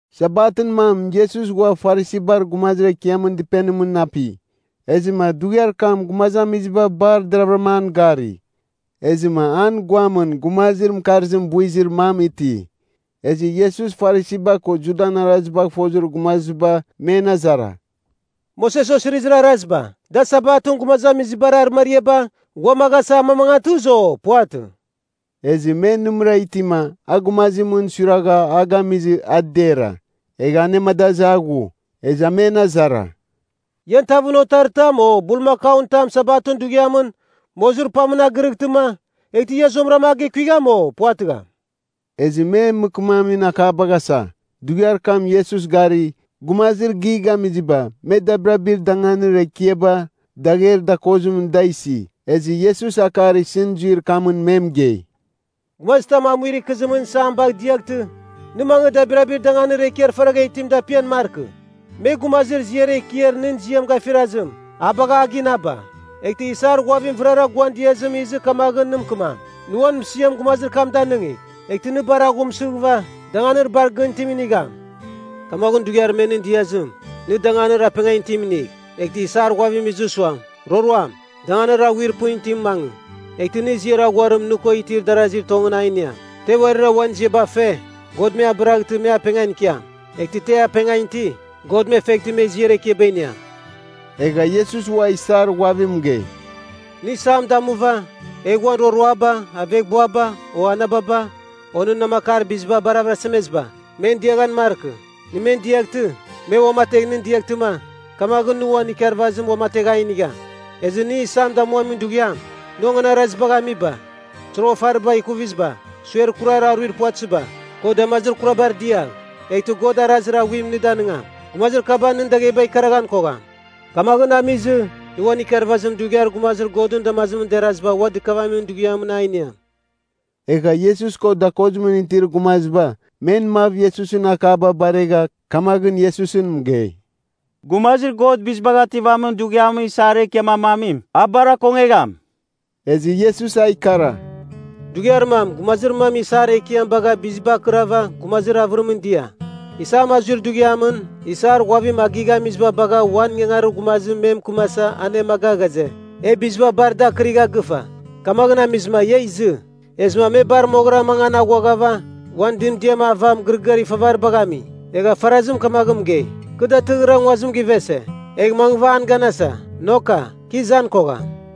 Sabatɨn mam Iesus ghua Farisibar gumazir ekiamɨn dɨpenimɨn api. Ezɨma dughiar kam gumazamiziba bar deravɨram an gari. Ezɨma an guamɨn gumazir mɨkarzim buizir mam iti. Ezɨ Iesus Farisiba ko Judan arazibagh fozir gumaziba men azara, “Moses osirizir araziba, da Sabatɨn gumazamizibar arɨmariaba ghuamaghasa amamangatɨzɨ, o puvatɨ?” Ezɨ me nɨmɨra itima a gumazimɨn suiragha a gamizɨma a dera. Egha anemadazɨ a ghu. Ezɨ a men azara, “Ian tavɨn otaritam o bulmakaun tam Sabatɨn dughiam mozirpamɨn a gɨrɨghtɨma, eghtɨ nɨ zuamɨra a gekuigham, o puvatɨgham?” Ezɨ me mɨkɨmamin akabagh asa. Dughiar kam Iesus gari, gumazir gighamiziba me dabirabir danganir ekiaba dagher dakozimɨn da isi. Ezɨ Iesus akar isɨn zuir kamɨn me mɨgei, “Gumazitam amuir ikɨzimɨn isam bagh diaghtɨ, nɨ mangɨ dabirabir danganir ekiar faragha itim dapian markɨ. Me, gumazir ziar ekiar nɨn ziam gafirazim, a bagha a ginaba. Eghtɨ, isar ghuavir vɨrara guan diazim izɨ kamaghɨn nɨ mɨkɨmam, ‘Nɨ uan mɨsiam gumazir kam danɨngigh.’ Eghtɨ nɨ bar aghumsɨghɨva, danganir bar gɨn itim inigham. Kamaghɨn dughiar me nɨn diazim, nɨ danganir apengan itim inigh, eghtɨ isar ghuavim izɨ suam, ‘Roroam, danganir aghuir pɨn itimɨn mangɨ.’ Eghtɨ nɨ ziar aghuarim nɨ ko itir darazir tongɨn a iniam. Te uarira uan ziaba fe, God me abɨraghtɨ, me apengan ikiam. Eghtɨ te apengan iti, God me feghtɨ me ziar ekiaba iniam.” Egha Iesus ua isar ghuavim mɨgei, “Nɨ isam damuva, egh uan roroaba, aveghbuaba, o anababa, o nɨn namakar biziba bar avɨrasemeziba, me diaghan markɨ. Nɨ men diaghtɨ, me uamategh nɨn diaghtɨma, kamaghɨn nɨ uan ikarvazim uamategh a inigham. Ezɨ nɨ isam damuamin dughiam, nɨ onganarazibagh amiba, soroghafariba ikuviziba, suer kurar aruir puvatɨziba, ko damazir kurabar diagh. Eghtɨ God arazir aghuim nɨ damigham. Gumazir kaba nɨn dagheba ikaraghan kogham. Kamaghɨn amizim, nɨ uan ikarvazim dughiar gumazir Godɨn damazimɨn deraziba ua dɨkavamin dughiamɨn a iniam.” Egha Iesus ko dakozimɨn itir gumaziba men mav Iesusɨn akaba baregha, kamaghɨn Iesusɨn mɨgei, “Gumazir God Bizibagh Ativamin Dughiamɨn isar ekiam ramamim, a bar akongegham.” Ezɨ Iesus a ikara, “Dughiar mam gumazir mam isar ekiam bagh bizibar akɨrava gumazir avɨrimɨn dia. Isam azuir dughiamɨn isar ghuavim a gighamiziba bagha uan ingangarir gumazim me mɨkɨmasa anemaga ghaze, ‘E biziba bar dar akɨrigha gɨfa, kamaghɨn amizɨma ia izɨ.’ “Ezɨma me bar moghɨra mangan aghuaghava uan dɨmdiam ava mɨgɨrɨgɨar ifavaribagh ami. Egha farazim kamaghɨn mɨgei, ‘Kɨ datɨrɨghɨra nguazim givese, egh mangɨva an ganasa. Noka, kɨ izan kogham.’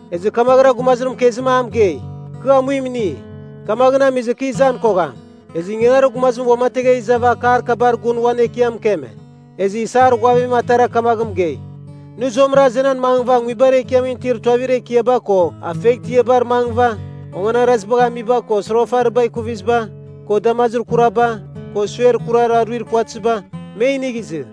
Ezɨ kamaghɨra gumazir mɨkezim a mɨgei, ‘Kɨ amuim ini, kamaghɨn amizɨ kɨ izan kogham.’ “Ezɨ ingangarir gumazim uamategha izava akar kabar gun uan ekiam mɨkeme. Ezɨ isar ghuavim atara kamaghɨn mɨgei, ‘Nɨ zuamɨra azenan mangɨva nguibar ekiamɨn itir tuavir ekiaba ko afeghtiabar mangɨva onganarazibagh amiba, ko soroghafariba ikuviziba, ko damazir kuraba, ko suer kurar aruir puvatɨziba, me inigh izɨ.’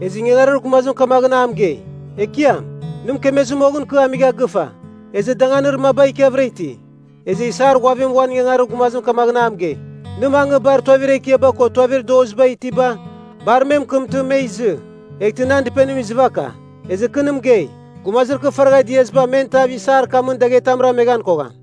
Ezɨ ingangarir gumazim kamaghɨn a mɨgei, ‘Ekiam, nɨ mɨkemezir moghɨn kɨ amigha gɨfa, ezɨ danganir maba ikiavɨra iti.’ Ezɨ isar ghuavim uan ingangarir gumazim kamaghɨn a mɨgei, ‘Nɨ mangɨ bar tuavir ekiaba ko tuavir dozibar itiba bar me mɨkɨmtɨ, me izɨ, eghtɨ nan dɨpenim izɨvaka. Ezɨ, kɨ nɨ mɨgei, gumazir kɨ faragha diaziba men tav isar kamɨn dagher tam rameghan kogham.’”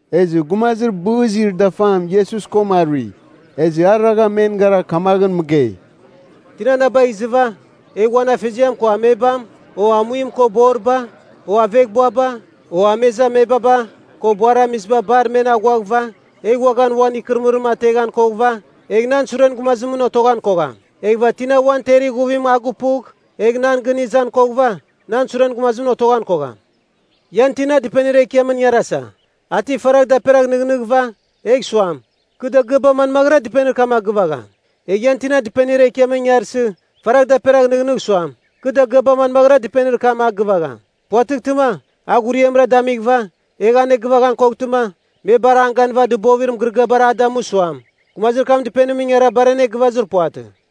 Ezɨ gumazir bɨzir dafam Iesus koma arui. Ezɨ a ragha men gara kamaghɨn mɨgei, “Tina na bagh izɨva, egha uan afeziam ko amebam, o amuim ko boriba, o aveghbuaba, o amezamebaba ko buaramiziba bar men aghuaghɨva, egha uaghan uan ikɨrɨmɨrim ateghan koghɨva, egh nan suren gumazimɨn otoghan kogham. Eghɨva tina uan ter ighuvim a gupugh, egh nan gɨn izan koghɨva, nan suren gumazimɨn otoghan kogham. “Ian tina dɨpenir ekiamɨn ingarasa, a ti faragh daperagh nɨghnighɨva, egh suam, kɨ dagɨaba manmaghɨra dɨpenir kam a gɨvagham? Egh ian tina dɨpenir ekiamɨn ingarsɨ, faragh daperagh nɨghnɨgh suam, ‘Kɨ dagɨaba manmaghɨra dɨpenir kam a gɨvagham?’ Puvatɨghtɨma, a ghuriamra damighɨva, egh anegɨvaghan koghtɨma, me bar an ganɨva dɨbovir mɨgɨrɨgɨabar a damu, suam, ‘Gumazir kam dɨpenimɨn ingara bar anegɨvazir puvatɨ.’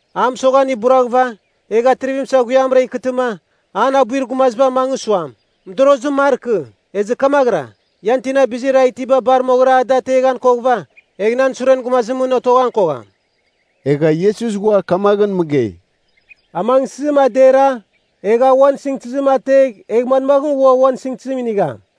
A mɨsoghan buraghɨva, egh atrivim saghuiamɨra ikɨtɨma, an abuir gumaziba mangɨ suam, mɨdorozim markɨ. Ezɨ kamaghɨra, ian tina bizir a itiba bar moghɨra a da ateghan koghɨva, egh nan suren gumazimɨn otoghan kogham.” Egha Iesus ghua kamaghɨn mɨgei, “Amangsɨzim a dera, egh a uan sɨngtɨzim ategh egh manmaghɨn ua uan sɨngtɨzim inigham?